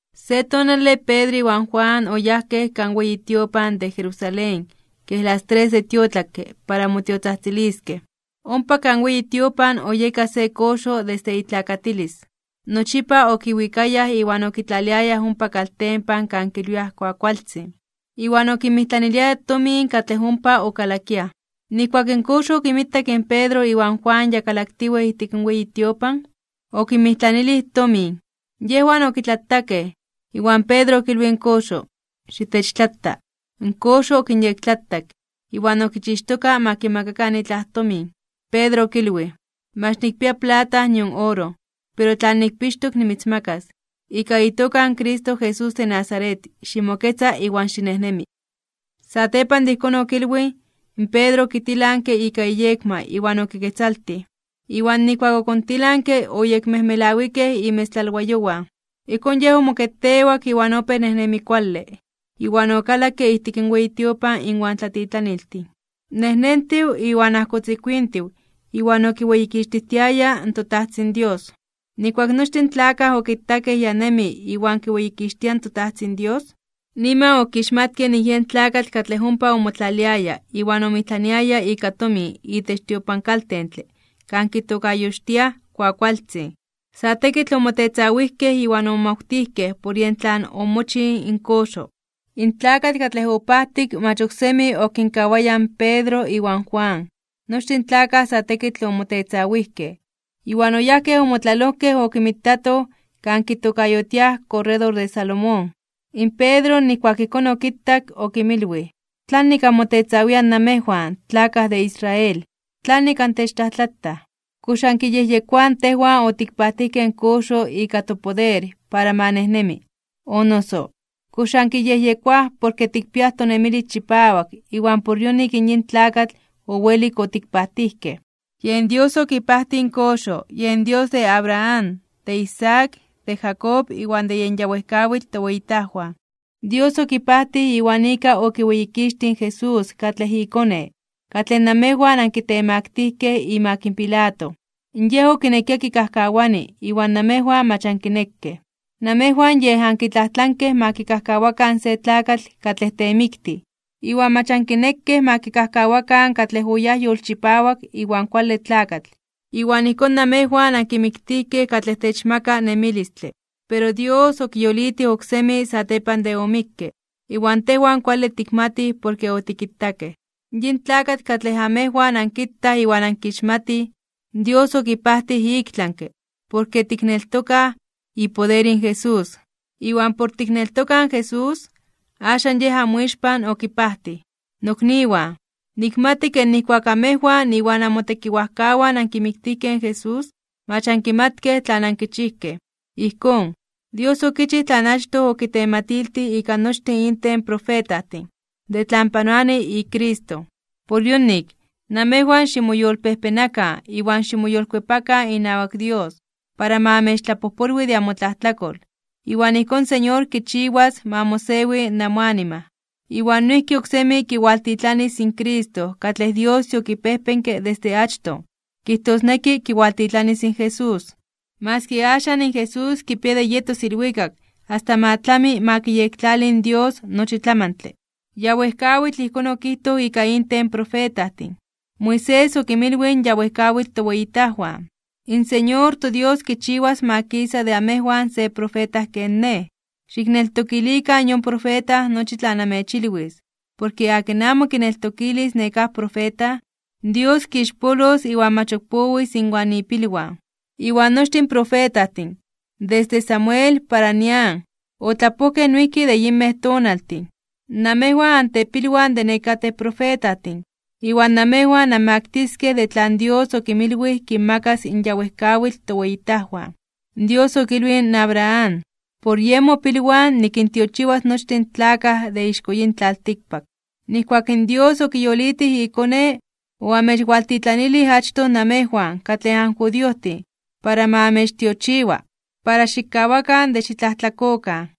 Se tonale, Pedro iwan Juan oyajkej kan weyi tiopan de Jerusalén kej las tres de tiotlakke para motiotzajtziliskej. Ompa kan weyi tiopan oyeka se koxo desde itlakatilis, nochipa okiwikayaj iwan okitlaliayaj ompa kaltempan kan kilwiaj Kuakualtzin, iwan okinmijtlaniliaya tomin katlej ompa okalakiaj. Nijkuak in koxo okinmitak in Pedro iwan Juan ya kalaktiwej ijtik in weyi tiopan, okinmijtlanilij tomin. Yejwan okitlatakej, iwan Pedro okilwij in koxo: ―Xitechtlata. In koxo okinyektlatak, iwan okichixtoka ma kimakakan itlaj tomin. In Pedro okilwij: ―Mach nikpia plata nion oro, pero tlan nikpixtok nimitzmakas. Ika itoka in Cristo Jesús de Nazaret, ximoketza iwan xinejnemi. Satepan de ijkón okilwij, in Pedro okitilanke ika iyekma iwan okiketzaltij, iwan nijkuak okontilanke oyekmejmelawikej imetztlalwayowan. Ijkón yej omoketewak iwan opéj nejnemi kuale, iwan okalakke ijtik in weyi tiopan inwan tlatitlaniltin, nejnentiw iwan ajkotzikuintiw iwan okiweyikixtijtiaya in toTajtzin Dios. Nijkuak nochtin in tlakaj okitakej ya nemi iwan kiweyikixtia in toTajtzin Dios, niman okixmatkej nik yen tlakatl katlej ompa omotlaliaya iwan omijtlaniaya ika tomin itech tiopankaltentle kan kitokayotiaj Kuakualtzin. Sa tekitl omotetzawijkej iwan omomawtijkej por yen tlan omochij in koxo. In tlakatl katlej opajtik mach ok semi okinkawaya in Pedro iwan Juan. Nochtin in tlakaj sa tekitl omotetzawijkej, iwan oyajkej omotlalojkej okinmitatoj kan kitokayotiaj Korredor de Salomón. In Pedro nijkuak ijkón okitak, okinmilwij: ―¿Tlanik anmotetzawiaj namejwan tlakaj de Israel? ¿Tlanik antechtlajtlataj? ¿Kox ankiyejyekoaj tejwan otikpajtijkej in koxo ika topoder para ma nejnemi? O noso ¿kox ankiyejyekoaj porke tikpiaj tonemilis chipawak iwan por yonik in yin tlakatl owelik otikpajtijkej? Yen Dios okipajtij in koxo, yen Dios de Abraham, de Isaac, de Jacob, iwan de yen ya wejkawitl toweyitajwan. Dios okipajtij iwan ika okiweyikixtij in Jesús katlej iKone, katlej namejwan ankitemaktijkej (okinkitemaktilijkej) imak Pilato, yej okinekia kikajkawani iwan namejwan mach ankinekej. Namejwan yej ankitlajtlankej ma kikajkawakan se tlakatl katlej temiktij, iwan mach ankinekej ma kikajkawakan katlej oyáj yolchipawak iwan kuale tlakatl. Iwan ijkón namejwan ankimiktijkej katlej techmaka nemilistle, pero Dios okiyolitij oksemi satepan de omikke, iwan tejwan kuale tikmatij porke otikitakej. Yin tlakatl katlej amejwan ankitaj iwan ankixmatij, Dios okipajtij iktlanke (ik tlami) porke tikneltokaj ipoder in Jesús. Iwan por tikneltokaj in Jesús, axan Yej amoixpan okipajtij. ’Nokniwan, nikmati ke nijkuak amejwan iwan amotekiwajkawan ankimiktijkej in Jesús, mach ankimatkej tlan ankichijkej. Ijkón, Dios okichij tlan achtoj okitematiltij ika nochtin inten in profetajtin, de tlan panoani iCristo. Por yonik, namejwan ximoyolpejpenakan iwan ximoyolkuepakan inawak Dios, para ma amechtlapojpolwi de amotlajtlakol, iwan ijkón in Señor kichiwas ma mosewi namoanima. Iwan noijki oksemi kiwaltitlanis in Cristo katlej Dios yokipejpenke desde achtoj, kijtosneki kiwaltitlanis in Jesús. Maski axan in Jesús kipia de yetos ilwikak asta ma tlami ma kiyektlali in Dios nochi tlamantle. Ya wejkawitl ijkón okijtoj ika inten in profetajtin. Moisés okinmilwij in ya wejkawitl toweyitajwan: “In Señor toDios kichiwas ma kisa de amejwan se profeta ken nej. Xikneltokilikan yon profeta nochi tlan anmechilwis, porke akin amo kineltokilis nekáj profeta, Dios kixpolos iwan mach ok powis inwan ipilwan.” ’Iwan nochtin in profetajtin, desde Samuel para nian, otlapojkej noijki de yinmej tonaltin. Namejwan antepilwan de nekatej profetajtin, iwan namejwan anmaktiskej de tlan Dios okinmilwij kinmakas in ya wejkawitl toweyitajwan. Dios okilwij in Abraham: “Por yen mopilwan nikintiochiwas nochtin in tlakaj de ixko yin tlaltikpak.” Nijkuak in Dios okiyolitij iKone, oamechwaltitlanilij achtoj namejwan katlej anjudiojtin para ma amechtiochiwa, para xikkawakan de xitlajtlakokan.